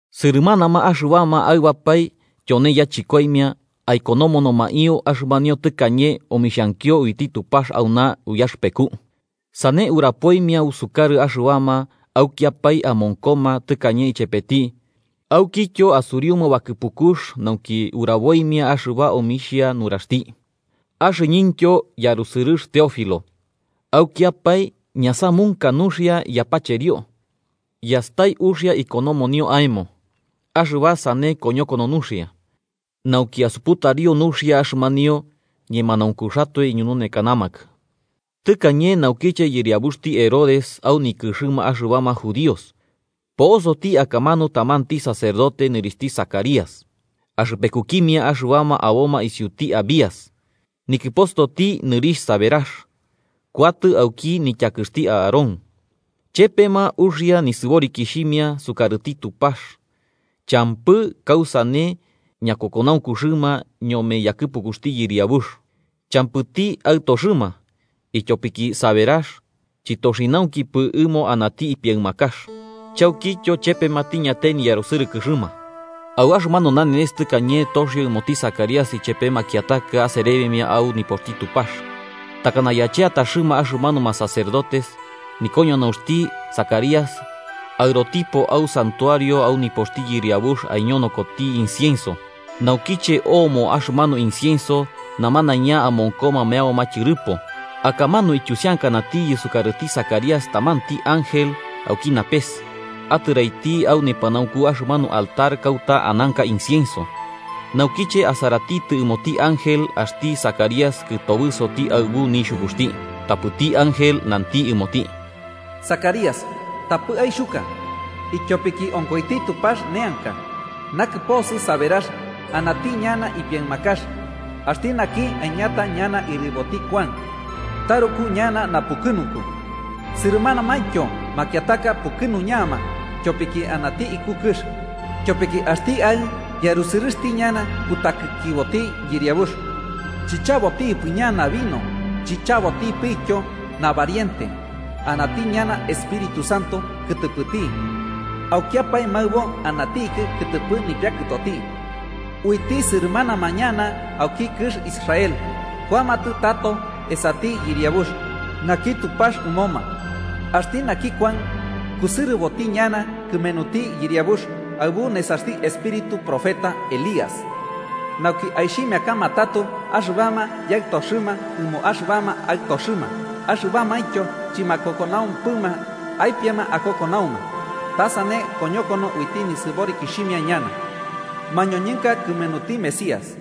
Sɨrɨmanama axɨbama aɨbapae tyone yachɨkoimia aikonomonomaio axɨmanio tɨkañe omixhankio uiti Tupax auna uyaxɨpeku, sane urapoimia usukarɨ axɨbama aukiapae amonkoma tɨkañe ichepeti aukityo asuriuma bakɨpukux nauki uraboimia axɨba omixhia nuraxti. Axɨñɨntyo, yarusɨrɨx Teófilo, aukiapae ñasamunka nuxia yapacherio, yastai uxia ikonomonio aemo axɨba sane koñokono nuxia, nauki asuputario nuxia axɨmanio ñemanaunkuxatoe iñununekanamakɨ. Tɨkañe naukiche yɨriabuxti Herodes au nikɨxɨma axɨbama judíos, po'osoti akamanu tamanti sacerdote nɨrixhti Zacarías, axɨpekukimia axɨbama aboma isiuti Abías. Nikɨpostoti, nɨrixh Saberax, kuatɨ auki nityakɨxti Aarón. Chepema uxia nisɨborikixhimia sukarɨti Tupax champɨ kausane ñakokonaunkuxɨma ñome yakɨpukuxti Yɨriabux. Champɨti aɨtoxɨma, ityopiki Saberax chɨtoxinaunkupɨ ɨmo anati ipiaɨmakax. Chaukityo, chepema tiñatai niyarusɨrɨkɨxɨma. Au axɨmanu nanenes tɨkañe toxio ɨmoti Zacarías ichepe makiataka aserebimia au nipoxti Tupax, takana yacheataxɨma axɨmanuma sacerdotes, nikoñonaunxti Zacarías aɨrotipo au santuario au nipoxti Yɨriabux aiñonokoti incienso. Naukiche omo axɨmanu incienso, namanaiña amonkoma meaboma tyɨrɨpo. Akamanu ityusiankanatiyɨ sukarɨti Zacarías tamanti ángel auki napes, atɨraiti au nepanaunku axɨmanu altar kauta ananka incienso. Naukiche asaratitɨ ɨmoti ángel, axti Zacarías kɨtobɨsoti aɨbu nixhukuxti. Tapɨti ángel nanti ɨmoti: –Zacarías, tapɨ aixhuka, ityopiki onkoiti Tupax neanka, nakɨposɨ Saberax anati ñana ipiaɨmakax, axti naki aiñata ñana ɨriboti Kuan. Taruku ñana napukɨnunku, sɨrɨmanamaintyo makiataka pukɨnuñama tyopiki anati iku kɨx, tyopiki axti aɨ'ɨ yarusɨrɨxti ñana kutakikiboti Yɨriabux. Chichabotipɨ ñana vino chichabotipityo nabariente, anati ñana Espíritu Santo kɨtɨpɨti aukiapae maɨbo anatiki kɨtɨpɨ nipiakɨtoti. Uiti sɨrɨmanama ñana auki kɨx Israel kuamatɨ tato esati Yɨriabux naki Tupax ɨmoma. Axti naki Kuan kusɨrɨboti ñana kɨmenuti Yɨriabux, aɨbu nesaxti espíritu profeta Elías, nauki aixhimiakama tato axɨbama yaɨtoxɨma ɨmo axɨbama aɨtoxɨma axɨbamaintyo chɨmakokonaumpɨma aipiama akokonauma. Ta sane koñokono uiti nisɨborikixhimia ñana mañoñɨnka kɨmenuti Mesías.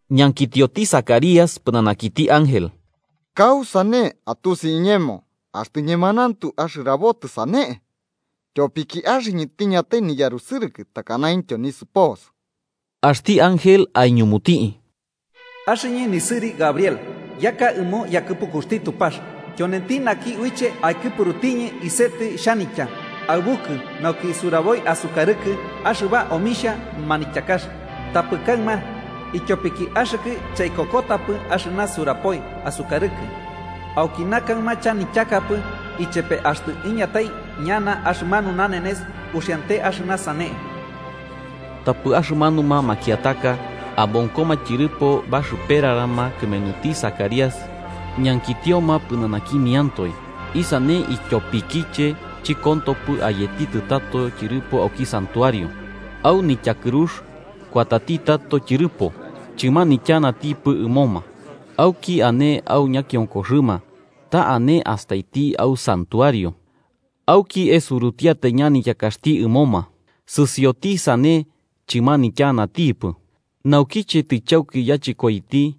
Ñankitioti Zacarías pɨnanakiti ángel: –¿Kausane atusi iñemo axtɨ ñemanauntu axɨrabotɨ sane? Tyopiki axɨñɨ tiñatai niyarusɨrɨkɨ takanaintyo nisɨposɨ. Axti ángel aiñumuti: –Axɨñɨ nisɨri Gabriel, yaka ɨmo yakɨpukuxti Tupax. Tyonenti naki uiche aikɨpurutiñɨ isetɨ xhanitya aɨbukɨ nauki suraboi asukarɨkɨ axɨba omixhia manityakax. Tapɨ kaɨma, ityopiki axɨkɨ chaikokotapɨ axɨna surapoi asukarɨkɨ, aukina kaɨma chanityakapɨ. Ichepe axtɨ iñatai ñana axɨmanu nanenes, uxiante axɨna sane. Tapɨ axɨmanuma makiataka, amonkoma tyɨrɨpo baxɨperarama kɨmenuti Zacarías ñankitioma pɨnanakimiantoe isane ityopikiche chɨkontopɨ ayetitɨ tato tyɨrɨpo auki santuario. Au nityakɨrux kuatati tato tyɨrɨpo, chɨmanityanatipɨ ɨmoma. Auki ane au ñakionkoxɨma ta ane astaiti au santuario, auki esurutiatai ñanityakaxti ɨmoma. Sɨsioti sane, chɨmanityanatipɨ. Naukiche tɨchauki yachɨkoiti,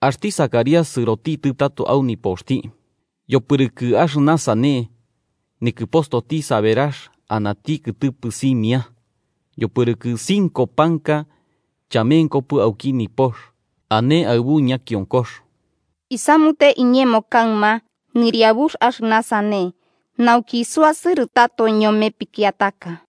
axti Zacarías sɨrotitɨ tato au nipoxti. Yopɨrɨkɨ axɨna sane, nikɨpostoti Saberax anati kɨtɨpɨ simia, yopɨrɨkɨ cinco panka chamenkopɨ auki nipox, ane aɨbu ñakionkox: “Isamute iñemo kaɨma Yɨriabux axɨna sane, nauki isuasɨrɨ tato ñome pikiataka.”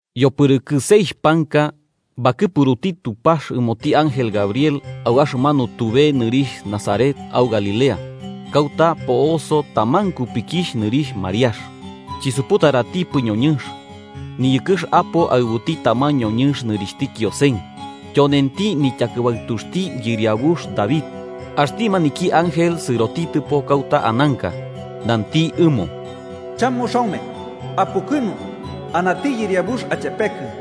Yopɨrɨkɨ seixh panka, bakɨpuruti Tupax ɨmoti ángel Gabriel au axɨmanu tube nɨrixh Nazaret au Galilea, kauta po'oso taman kupikixh nɨrixh Mariax. Chisuputaratipɨ ñoñɨnx, tɨniyɨkɨx apo aɨbuti taman ñoñɨnx nɨrixhti Kiosen, tyonenti nityakɨbaɨtuxti yɨriabux David. Axti maniki ángel sɨrotitɨpo kauta ananka, nanti ɨmo: –¡Chamuxaume, apukɨnu! Anati Yɨriabux achepekɨ.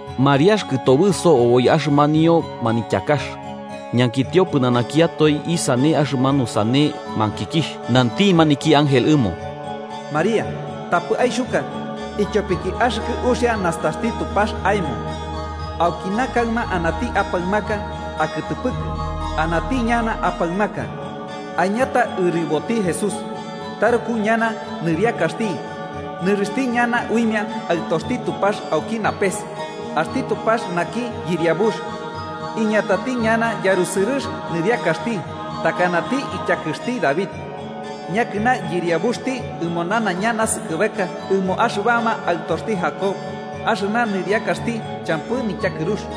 Mariax kɨtobɨso oboi axɨmanio manityakax, ñankitio pɨnanakiatoe isane axɨmanu sane mankikixh. Nanti maniki ángel ɨmo: –Mariax, tapɨ aixhuka, ityopiki axɨkɨ uxia nastaxti Tupax aemo. Aukina kaɨma anati apaɨmaka akɨtɨpɨkɨ: anati ñana apaɨmaka, aiñata ɨriboti Jesús. Taruku ñana nɨriakaxti, nɨrixhti ñana uimia Aɨtoxti Tupax auki napes, axti Tupax naki Yɨriabux iñatati ñana yarusɨrɨx Nɨriakaxti, takanati ityakɨxti David, yakɨna yɨriabuxti ɨmo nanaiña naskɨbeka ɨmo axɨbama aɨtoxti Jacob. Axɨna nɨriakaxti champɨ nityakɨrux.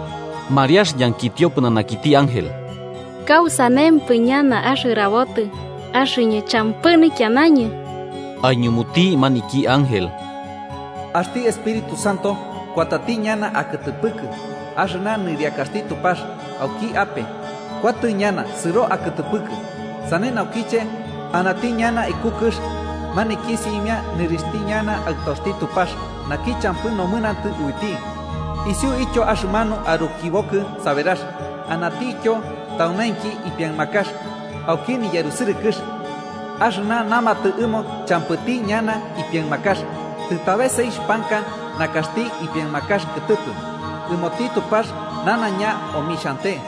Mariax ñankitio pɨnanakiti ángel: –¿Kausanempɨ ñana axɨrabotɨ, axɨñɨ champɨ nikianañɨ? Aiñumuti maniki ángel: –Axti Espíritu Santo kuatati ñana akɨtɨpɨkɨ, axɨna nɨriakaxti Tupax auki ape kuatɨ ñana sɨro akɨtɨpɨkɨ. Sane naukiche, anati ñana iku kɨx maniki simia nɨrixhti ñana Aɨtoxti Tupax naki champɨ nomɨnantɨ uiti. Isiuityo axɨmanu arukibokɨ Saberax anatityo taunainki ipiaɨmakax, auki niyarusɨrɨkɨx. Axɨna namatɨ ɨmo champɨti ñana nipiaɨmakax, tɨtabe seixh panka nakaxti ipiaɨmakax kɨtɨpɨ. Ɨmoti Tupax nanaiña omixhante.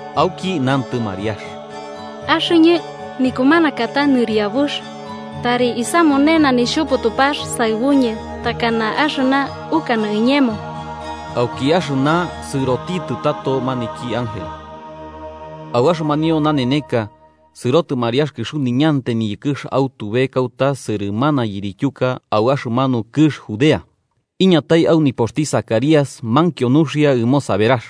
Auki nantɨ Mariax: –Axɨñɨ nikumanakata Nɨriabux. Tari isamunena Nixhupu Tupax saɨbuñɨ takana axɨna ukanɨ iñemo. Auki axɨna, sɨrotitɨ tato maniki ángel. Au axɨmanio naneneka, sɨrotɨ Mariax kɨxuniñantai niyɨkɨx au tube kauta sɨrɨmana yirityuka au axɨmanu kɨx Judea, iñatai au nipoxti Zacarías mankio nuxia ɨmo Saberax.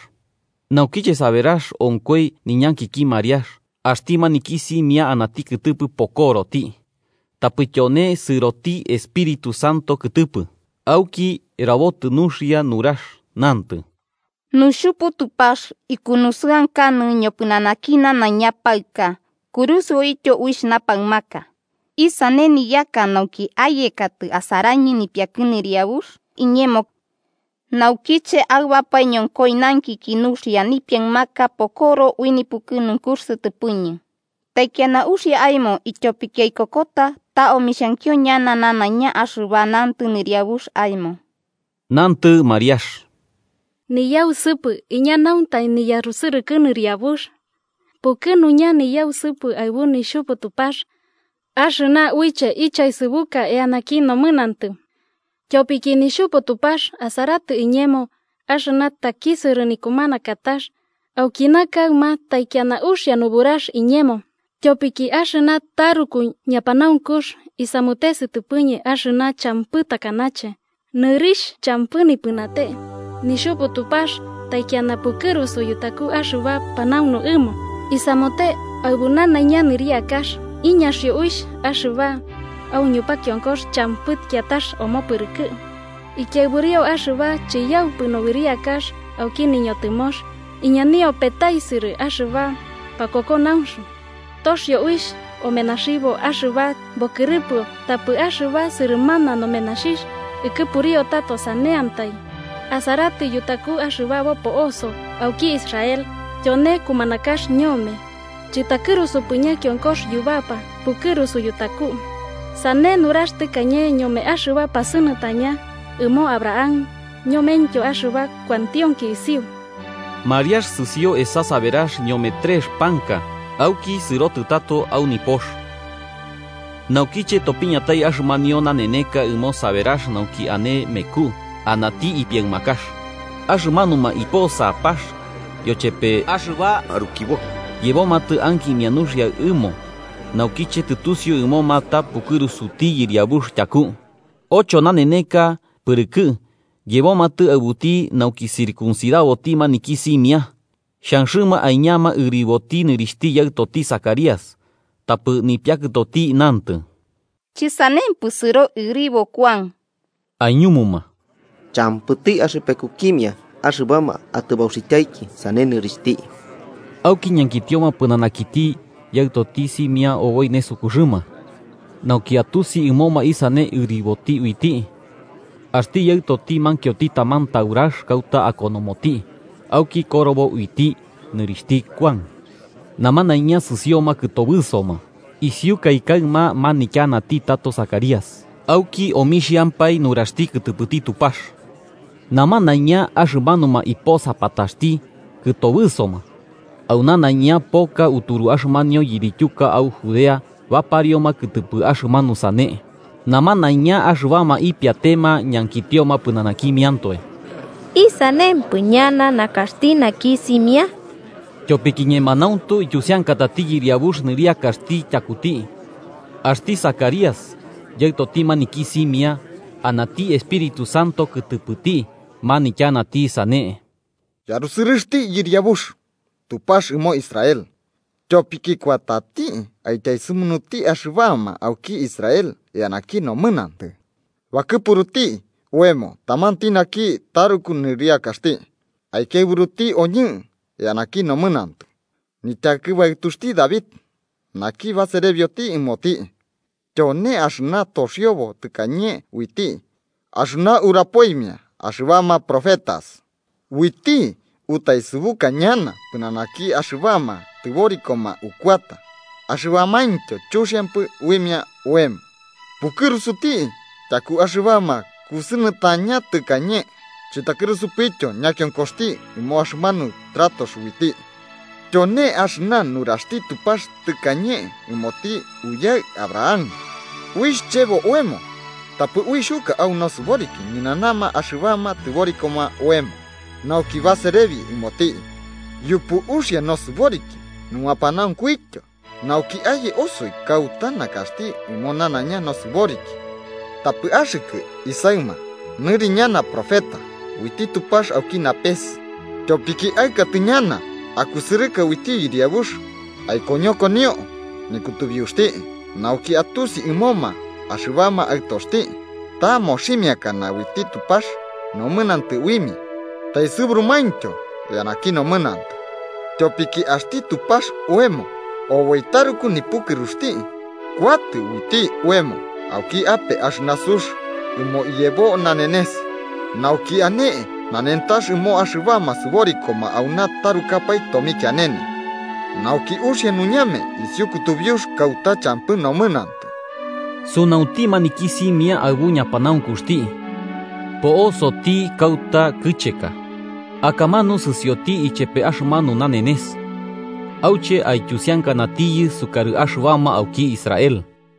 Naukiche Isabel onkoi niñankiki Mariax, axti maniki simia anati kɨtɨpɨ bakɨkiyoti, tapɨ tyone sɨroti Espíritu Santo kɨtɨpɨ. Auki, rabotɨ nuxia nurax, nantɨ: –¡Nuxhupu Tupax ikunusɨankanɨ ñopɨnanaki nanaiña paɨka, kurusɨoityo uixh napaɨmaka! ¿Isane niyaka, nauki ayekatɨ asarañɨ nipiakɨ Nɨriabux iñemo? Naukiche aɨbapae ñonkoi nankiki nuxia, nipiaɨmaka bakɨkiyo ui nipukɨnunkux sɨtɨpɨñɨ. ¡Taikiana uxia aemo ityopiki aikokota ta omixhankio ñana nanaiña axɨba nantɨ Nɨriabux aemo! Nantɨ Mariax: “Niyausɨpɨ iñanaunta niyarusɨrɨkɨ Nɨriabux. Pukɨnuña niyausɨpɨ aɨbu Nixhupu Tupax axɨna uiche ichaesɨbuka eanaki nomɨnantɨ. Tyopiki Nixhupu Tupax asaratɨ iñemo, axɨna takisɨrɨ nikumanakatax, aukina kaɨma taikiana uxia nuburax iñemo. Tyopiki axɨna taruku ñapanaunkux isamute sɨtɨpɨñɨ axɨna champɨ takanache. ¡Nɨrixh champɨ nipɨnate! Nixhupu Tupax taikiana pukɨrusu yutaku axɨba panaunu ɨmo. Isamute aɨbu nanaiña nɨriakax: iñaxio uixh axɨba au ñupakionkox champɨ kiatax omopɨrɨkɨ, ikiaɨburio axɨba chiyaupɨ nobɨriakax auki niñotɨmox iñanio petaisɨrɨ axɨba pakokonaunx. Toxio uixh omenaxibo axɨba bokɨrɨpɨo tapɨ axɨba sɨrɨmana nomenaxixh ikɨpuriu tato saneantai. Asaratɨ yutaku axɨba bopo'oso auki Israel, tyone kumanakax ñome, chɨtakɨrusupɨ ñakionkox yubapa pukɨrusu yutaku. Sane nurax tɨkañe ñome axɨba pasɨnɨtɨña, ɨmo Abraham ñomentyo axɨba kuantionki isiu.” Mariax sɨsio esa Saberax ñome trex panka, auki sɨrotɨ tato au nipox. Naukiche topiñatai axɨmanio naneneka ɨmo Saberax nauki ane meku, anati ipiaɨmakax. Aximanuma iposapax yochepe axɨba arukibo yebomatɨ ankimia nuxia ɨmo naukiche tɨtusiu ɨmoma ta pukɨrusuti Yɨriabux tyaku. Ocho naneneka pɨrɨkɨ, yebomatɨ aɨbuti nauki circuncidaboti maniki simia, xhanxɨma aiñama ɨriboti nɨrixhti yaɨtoti, Zacarías. Tapɨ nipiakɨtoti nantɨ: –Chɨsanempɨ. Sɨro ɨribo Kuan. Aiñumuma: –Champɨti axɨpekukimia axɨbama atɨbauxityaiki sane nɨrixhti. Auki ñankitioma pɨnanakiti yaɨtoti simia oboi nesukuxɨma, nauki atusi ɨmoma isane ɨriboti uiti. Axti yaɨtoti mankioti taman taurax kauta akonomoti, auki korobo uiti: ‘Nɨrixhti Kuan.’ Namanaiña sɨsioma kɨtobɨsoma. Isiukai kaɨma manityanati tato Zacarías, auki omixhampae nuraxti kɨtɨpɨti Tupax. Namanaiña axɨmanuma iposapataxti kɨtobɨsoma, au nanaiña poka uturu axɨmanio yirityuka au Judea baparioma kɨtɨpɨ axɨmanu sane. Namanaiña axɨbama ipiatema ñankitioma pɨnanakimiantoe: “¿Isanempɨ ñana nakaxti naki simia?” Tyopiki ñemanauntu ityusiankatati Yɨriabux nɨriakaxti tyakuti. Axti Zacarías, yaɨtoti maniki simia, anati Espíritu Santo kɨtɨpɨti manityanati sane: “¡Yarusɨrɨxti Yɨriabux, Tupax ɨmo Israel, tyopiki kuatati aityaesɨmunuti axɨbama auki Israel eanaki nomɨnantɨ! Bakɨpuruti oemo tamanti naki taruku nɨriakaxti aikiaɨburuti oñɨ eanaki nomɨnantɨ, nityakɨbaɨtuxti David, naki baserebioti ɨmoti. Tyone axɨna toxiobo tɨkañe uiti axɨna urapoimia axɨbama profetas: uiti utaesɨbuka ñana pɨnanaki axɨbama tɨborikoma ukuata axɨbamaintyo chuxiampɨ uimia oemo, pukɨrusuti tyaku axɨbama kusɨnɨtaña tɨkañe chɨtakɨrusupityo ñakionkoxti ɨmo axɨmanu tratox uiti. Tyone axɨna nuraxti Tupax tɨkañe ɨmoti uyaɨ Abraham: uixh chebo oemo tapɨ uixhuka au nosɨboriki, ñɨnanama axɨbama tɨborikoma oemo, nauki baserebi ɨmoti yupu uxia nosɨboriki numapanaunkuityo, nauki aye osoi kauta nakaxti ɨmo nanaiña nosɨboriki. Tapɨ axɨkɨ, isaɨma, nɨri ñana profeta uiti Tupax auki napes, tyopiki aɨkatɨ ñana akusɨrɨka uiti Yɨriabux aikoñokonio nikutubiuxti, nauki atusi ɨmoma axɨbama aɨtoxti ta moximiakana uiti Tupax nomɨnantɨ uimia taesɨburumaintyo eanaki nomɨnantɨ. Tyopiki axti Tupax oemo, oboi taruku nipukɨruxti, kuatɨ uiti oemo auki ape axɨna sux ɨmo iyebo nanenes, nauki ane nanentax ɨmo axɨbama sɨborikoma auna tarukapae tomikianene, nauki uxia nuñame isiu kutubiux kauta champɨ nomɨnantɨ.” Sunaunti maniki simia aɨbu ñapanaunkuxti, po'osoti kauta kɨcheka akamanu sɨsioti ichepe axɨmanu nanenes auche aityusiankanatiyɨ sukarɨ axɨbama auki Israel.